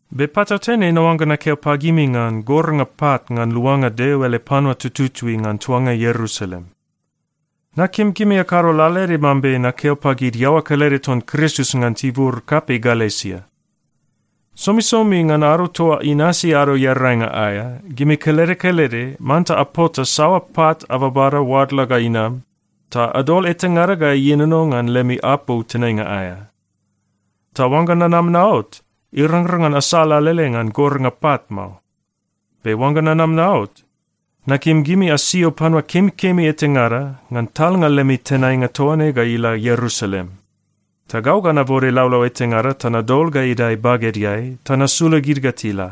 Be patautene naoangga nakeo pagimi ngan gornga pat ngan luanga Deo ele panua tututui ngan tuanga Ierusalem. Nakim gimi akado lalaede mambe nakeo pagid iaoa kelede ton Kristus ngan tibur kapei Galesia. Somisomi ngan ado toa inasi Ado Earainga aea, gimi kelede kelede manta apota saoa pat ababada oadla ga inam, ta adol etangada ga ienono ngan lemi apou tenainga aea. Ta oangga nanam naot, irangrang ngan asal alele ngan gornga pat mao. Be oangga nanam naot, nakim gimi asio panua kemikemi etangada ngan talnga lemi tenainga toa ne ga ila Ierusalem. Ta gau ga nabode laulau etangada ta nadol ga idae bagedeai ta nasula gid ga tila.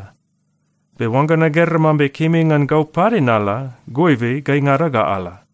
Be oangga nagera mambe kemi ngan gau pade nala, goibe gaingada ga ala.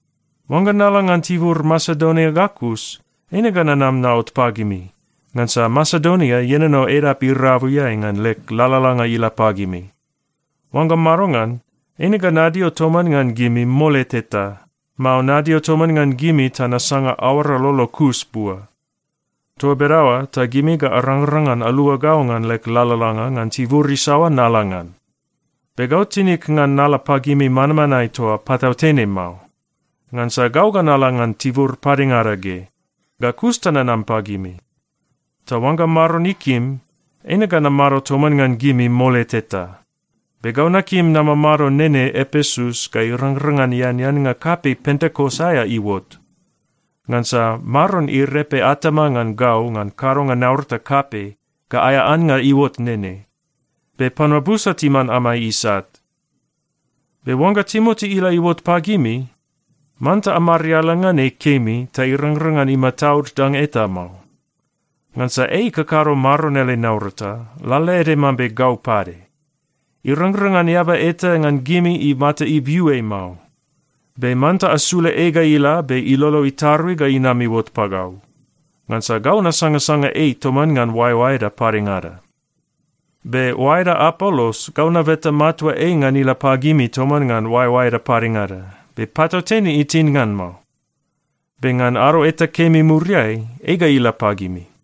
Oangga nala ngan tibur Masedonia ga kus, eine ga nanam naot pagimi, ngansa Masedonia ienono edap irabuiai ngan leg lalalanga ila pagimi. Oangga madongan, eine ga nadio toman ngan gimi mole teta, mao nadio toman ngan gimi ta nasanga aoara lolo kus bua. Toa bedaoa ta gimi ga arangrang ngan alua gau ngan leg lalalanga ngan tibur isaoa nala ngan. Be gau tinig ngan nala pagimi manmanae toa patautene mao. Ngansa gau ga nala ngan tibur padengada ge. Ga kus ta nanam pagimi. Ta oangga Maron ikim, eine ga namado toman ngan gimi mole teta. Be gau nakim namamado nene Epesus ga irangrang ngan eaneannga kapei Pentekos aea iuot. Ngansa Maron irepe atama ngan gau ngan kadonga naurata kapei ga aea annga iuot nene. Be panua busa timan amai isat. Be oangga Timoti ila iuot pagimi, manta amariala ngan ei kemi ta irangrang ngan imataud danga eta mao. Ngansa ei ikakado Maron ele naurata lalaede mambe gau pade. Irangrang ngan eaba eta ngan gimi imata ibiu ei mao. Be manta asula ei ga ila be ilolo itarui ga inam iuot pagau. Ngansa gau nasangasanga ei toman ngan oaeoaeda padengada. Be oaeda Apolos, gau nabeta matua ei ngan ila pagimi toman ngan oaeoaeda padengada. Be patautene itin ngan mao. Be ngan ado eta kemi muriai, ei ga ila pagimi.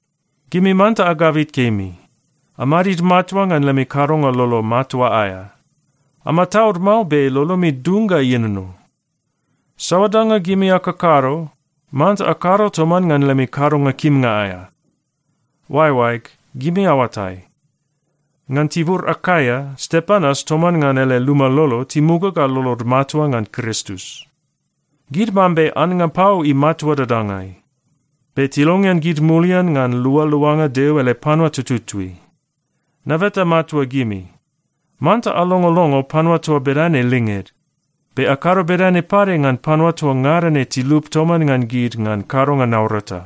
Gimi manta agabit kemi. Amadid matua ngan lemi kadonga lolo matua aea. Amataud mao be lolomi dung ga ienono. Saoa danga gimi akakado, manta akado toman ngan lemi kadonga kimnga aea. Oaeoaeg, gimi aoatai, ngan tibur Akaia, Stepanas toman ngan ele luma lolo timuga ga lolod matua ngan Kristus. Gid mambe annga pau imatua dadangai. Be tilongean gid mulian ngan lualuanga Deo ele panua tututui. Nabeta matua gimi, manta alongolongo panua toa bedane linged. Be akado bedane pade ngan panua toa ngada ne tilup toman ngan gid ngan kadonga naurata.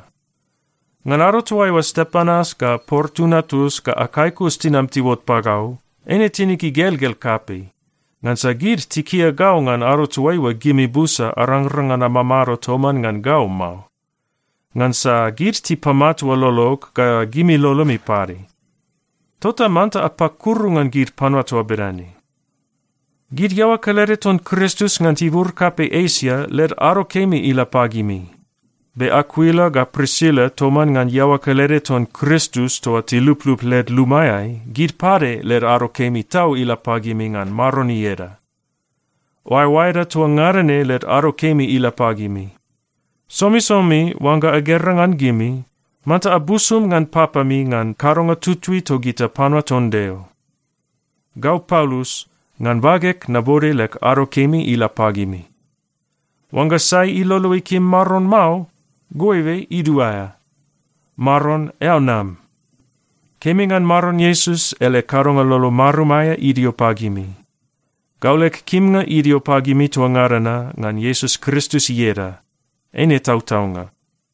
Ngan ado toaiua Stepanas ga Portunatus ga Akaikus tinam tiuot pagau, eine tinig igelgel kapei, ngansa gid tikia gau ngan ado toaiua gimi busa arangrang ngan amamado toman ngan gau mao. Ngansa gid tipamatua lolog ga gimi lolomi pade. Tota manta apakuru ngan gid panua toa bedane. Gid iaoa kelede ton Kristus ngan tibur kapei Esia led ado kemi ila pagimi. Be Akuila ga Prisila toman ngan iaoa kelede ton Kristus toa tiluplup led lumaeai, gid pade led ado kemi tau ila pagimi ngan Maron ieda. Oaeoaeda toa ngada ne led ado kemi ila pagimi. Somisomi oangga agera ngan gimi, manta abusum ngan papami ngan kadonga tutui togita panua ton Deo. Gau Paulus, ngan bageg nabode leg ado kemi ila pagimi. Oangga sai ilolo ikim Maron mao, goibe iduaea. Maron, eao nam. Kemi ngan Maron Iesus ele kadonga lolo marum aea idio pagimi. Gau leg kimnga idio pagimi toa ngada na ngan Iesus Kristus ieda. Eine tautaunga.